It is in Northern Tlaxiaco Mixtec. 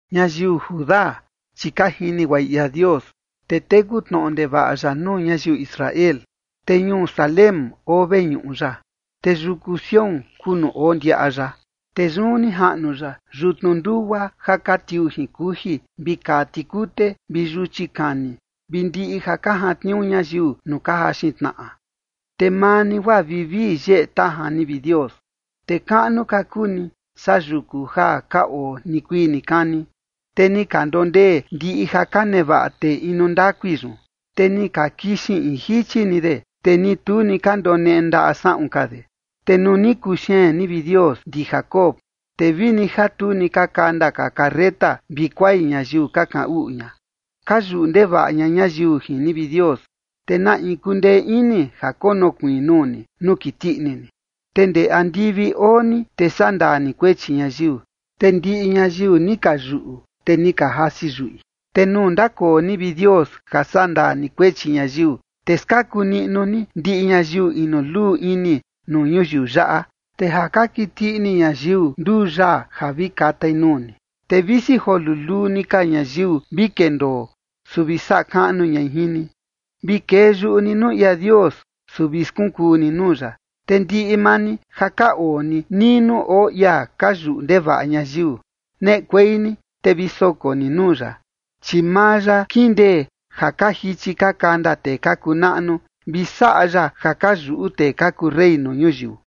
Ñayiu Judá, chi ka jini guaꞌi ia Dios, te teku tnoꞌo ndevaꞌa ya nuu ñayiu Israel. Te ñuu Salem oo veñuꞌu ya, te yuku Sión kuu nuu oo ndiaꞌa ya. Te yun ni jaꞌnu ya yutnu ndugua ja ka tiuu jin kuji, vi kaa tikute vi yuchi kani vi ndiꞌi ja ka jantniuu ñayiu nuu ka jaxin tnaꞌa. Te maa ni, guaa vivii yeꞌe tajan ni, vi Dios, te kaꞌnu ka kuu ni saa yuku ja ka oo nikuii nikani. Te ni ka ndondee ndiꞌi ja ka nevaꞌa tee inu ndakui yun, te ni ka kixin in jichi ni de, te ni tu ni ka ndoneꞌe ndaꞌa saꞌun ka de. Te nuu ni kuxeen ni, vi Dios ndi Jacob, te vini ja tu ni ka kanda ka carreta vi kuai ñayiu ka kaꞌan uꞌu ña. Ka yuꞌu ndevaꞌa ña ñayiu jin ni, vi Dios, ¿te na in kundee ini ja konokuiin nuu ni nuu kiti ini ni? Te ndee andivi oo ni, te sandaa ni kuechi ñayiu, te ndiꞌi ñayiu ni ka yuꞌu, te ni ka jasi yuꞌi. Te nuu ndakoo ni, vi Dios, ja sandaa ni kuechi ñayiu, te skaku niꞌnu ni ndiꞌi ñayiu inu luu ini nuu ñuyiu yaꞌa. Te ja ka kiti ini ñayiu nduu yaa ja vi katai nuu ni, te visi joo luluu ni ka ñayiu vi kendoo, su vi saꞌa kaꞌnu ñai jin ni. Vi kee yuꞌu ni nuu ia Dios, su vi skunkuu ni nuu ya. Te ndiꞌi maa ni ja ka oo ni nii nuu oo ia ka yuꞌu ndevaꞌa ñayiu, neꞌekuei ni te vi soko ni nuu ya, chi maa ya kindee ja ka jichi ka kanda tee ka kuu naꞌnu, vi saꞌa ya ja ka yuꞌu tee ka kuu rey nuu ñuyiu.